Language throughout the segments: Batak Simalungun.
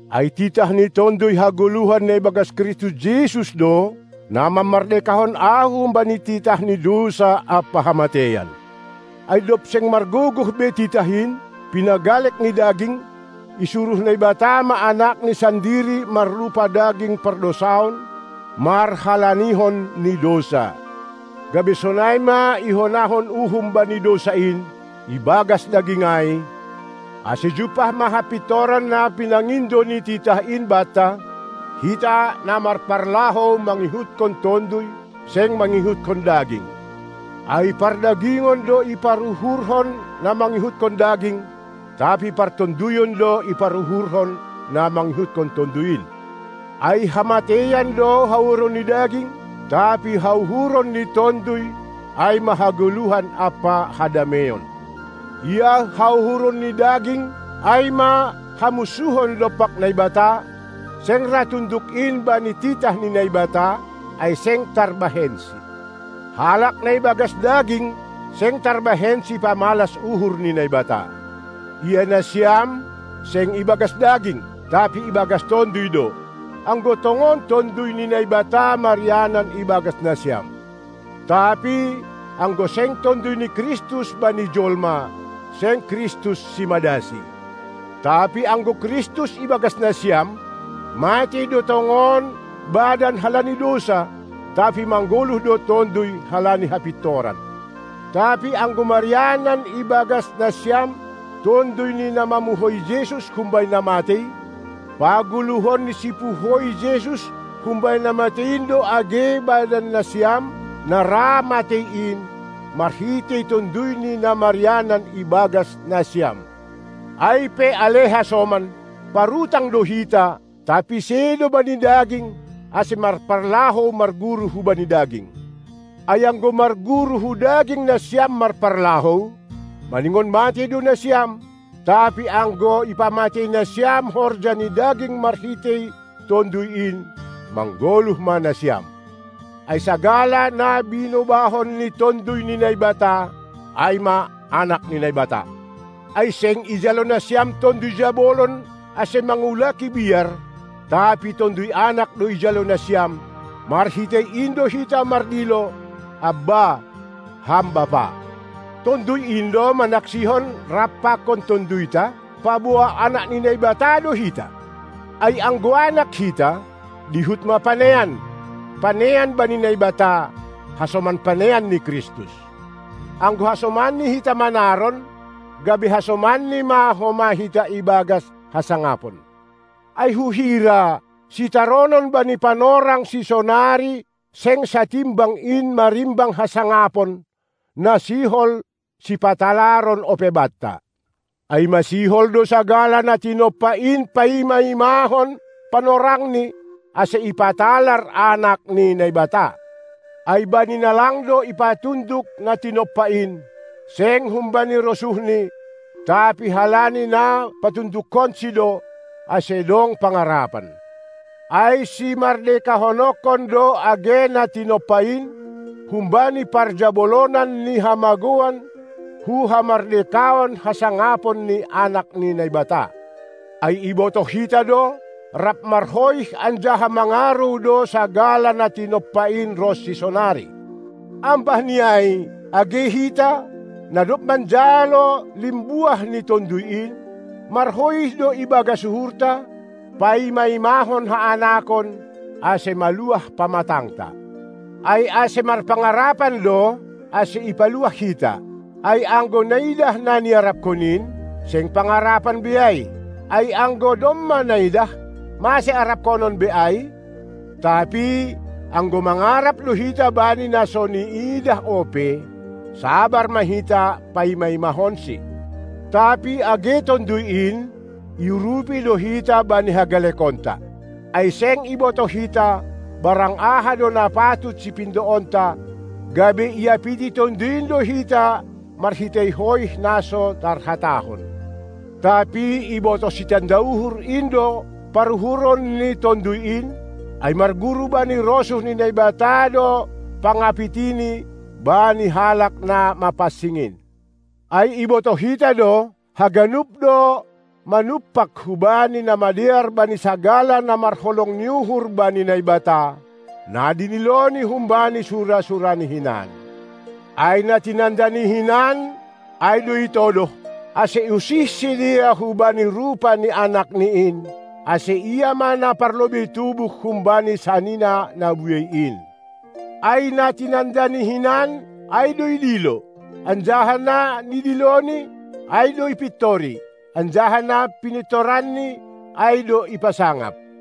Ai titah ni tonduy hagoluhan na ibagas Kristus Jesus do na mamardekahon ahu humbani titah ni dousa ampa hamateian. Ai dob seng margogoh be titah in, pinagalek ni daging, isuruh Naibata ma Anakni sandiri marrupa daging pardousaon, marhalanihon ni dousa. Gabe sonai ma ihonahon uhum bani dousa in, ibagas daging ai, ase jumpah ma hapintoran na pinangindo ni titah in banta, hita na marparlahou mangihutkon Tonduy, seng mangihutkon daging. Ai pardagingon do iparuhurhon na mangihutkon daging, tapi partonduyon do iparuhurhon na mangihutkon Tonduy in. Ai hamateian do hauhuron ni daging, tapi hauhuron ni Tonduy ai ma hagoluhan ampa hadameion. Ia hauhuron ni daging ai ma hamunsuhon dompak Naibata; seng ra tunduk in bani titah ni Naibata, ai seng tarbahensi. Halak na ibagas daging seng tarbahensi pamalas uhur ni Naibata. Ia nasiam, seng ibagas daging, tapi ibagas Tonduy do, anggo tongon Tonduy ni Naibata marianan ibagas nasiam. Tapi anggo seng Tonduy ni Kristus bani jolma, seng Kristus simadasi. Tapi anggo Kristus ibagas nasiam, matei do tongon badan halani dousa, tapi manggoluh do tonduy halani hapitoran. Tapi anggo marianan ibagas nasiam Tonduy ni na mamuhoi Jesus humbani na matei, pagoluhon ni Sipuhoi Jesus humbani na matei in do age badannasiam na ra matei in, marhitei Tonduyni na marianan ibagas nasiam. Ai pe ale hasoman, parutang do hita, tapi sedo bani daging, ase marparlahou marguru hubani daging. Ai anggo marguru hu daging nasiam marparlahou, maningon matei do nasiam; tapi anggo ipamatei nasiam horja ni daging marhitei Tonduy in, manggoluh ma nasiam. Ai sagala na binobahon ni Tonduy ni Naibata, ai ma anak ni Naibata. Ai seng ijalo nasiam tonduy jabolon ase mangulaki biar, tapi tonduy anak do ijalo nasiam; marhitei in do hita mardilo: Abba, Ham Bapa! Tonduy in do manaksihon rap pakon tonduyta, paboa anak ni Naibata do hita. Ai anggo anak hita, dihut ma panean, panean bani Naibata, hasoman panean ni Kristus. Anggo hasomanNi hita manaron, gabe hasomanNi ma homa hita ibagas hasangapon. Ai huhira, sitaronon bani panorang sisonari seng satimbang in marimbang hasangapon, na sihol sipatalaron ope banta. Ai masihol do sagala na tinompa in paima-imahon panorangni, ase ipatalar anak ni Naibata. Ai bani na lang do ipatunduk na tinompa in, seng humbani rosuhni, tapi halani na patundukkonsi do, ase dong pangarapan, ai simardekahononkon do age na tinompa in, humbani parjabolonan ni hamagouan hu hamardekaon hasangapon ni anak ni Naibata. Ai ibotoh hita do, rap marhoih anjaha mangarou do sagala na tinompa in ronsi sonari. Ambah ni ai, age hita, na dob manjalo limbuah ni Tonduy in, marhoih do ibagas uhurta, paima-imahon haanakon, ase maluah pamatangta. Ai ase marpangarapan do, ase ipaluah hita. Ai anggo naidah na niarapkon in, seng pangarapan be ai; ai anggo domma naidah, mase arapkonon be ai. Tapi, anggo mangarap do hita bani na so niidah ope, sabar ma hita paima-imahonsi. Tapi age Tonduy in, iurupi do hita bani hagalekonta. Ai seng ibotoh hita, barang aha do na patut sipindoonta, gabe iapiti Tonduy in do hita marhitei hoih na so tarhatahon. Tapi ibotoh Sitanda uhur in do paruhuron ni Tonduy in, ai marguru bani rosuh ni Naibata do pangapitini bani halak na mapansing in. Ai ibotoh hita do, haganup do manumpak hubani na madear bani sagala na marholong ni uhur bani Naibata, na nidiloNi humbani sura-suraNi hinan. Ai na tinandaNi hinan, ai do itodoh, ase usih sidea hubani rupa ni AnakNi in, ase Ia ma na parlobei tubuh humbani sanina na buei in. Ai na tinandaNi hinan, ai do idilo, anjaha na nidiloNi, ai do ipintori, anjaha na pinintoranNi, ai do ipasangap.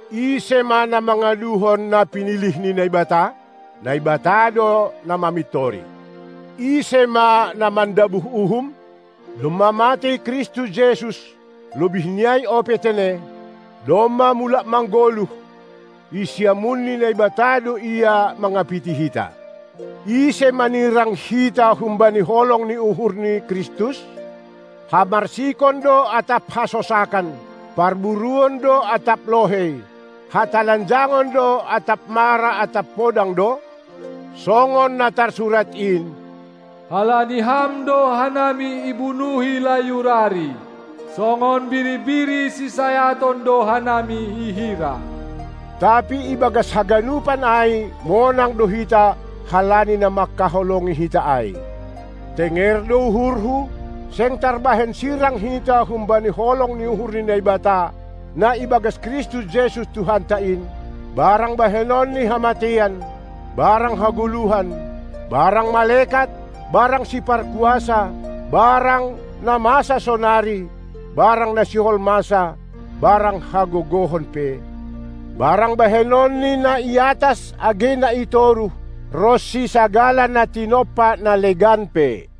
Ise ma na mangaduhon na pinilih ni Naibata? Naibata do na mamintori. Ise ma na mandabuh uhum? Domma matei Kristus Jesus, lobih ni ai ope tene, domma mulak manggoluh, i siamun ni Naibata do Ia mangapiti hita. Ise manirang hita humbani holong ni uhur ni Kristus? Hamarsikon do atap hasosakan, parburuon do atap lohei, hatalanjangon do atap mara atap podang do? Songon na tarsurat in: Halani Ham do hanami ibunuhi layur ari, songon biri-biri si sayaton do hanami ihira. Tapi ibagas haganupan ai monang do hita halani na mangkaholongi hita ai. Tenger do uhurhu, seng tarbahen sirang hita humbani holong ni uhur ni Naibata, na ibagas Kristus Jesus Tuhanta in, barang bahenon ni hamateian, barang hagoluhan, barang malekat, barang siparkuasa, barang na masa sonari, barang na sihol masa, barang hagogohon pe, barang bahenon ni na i atas age na i toruh, ronsi sagala na tinompa na legan pe.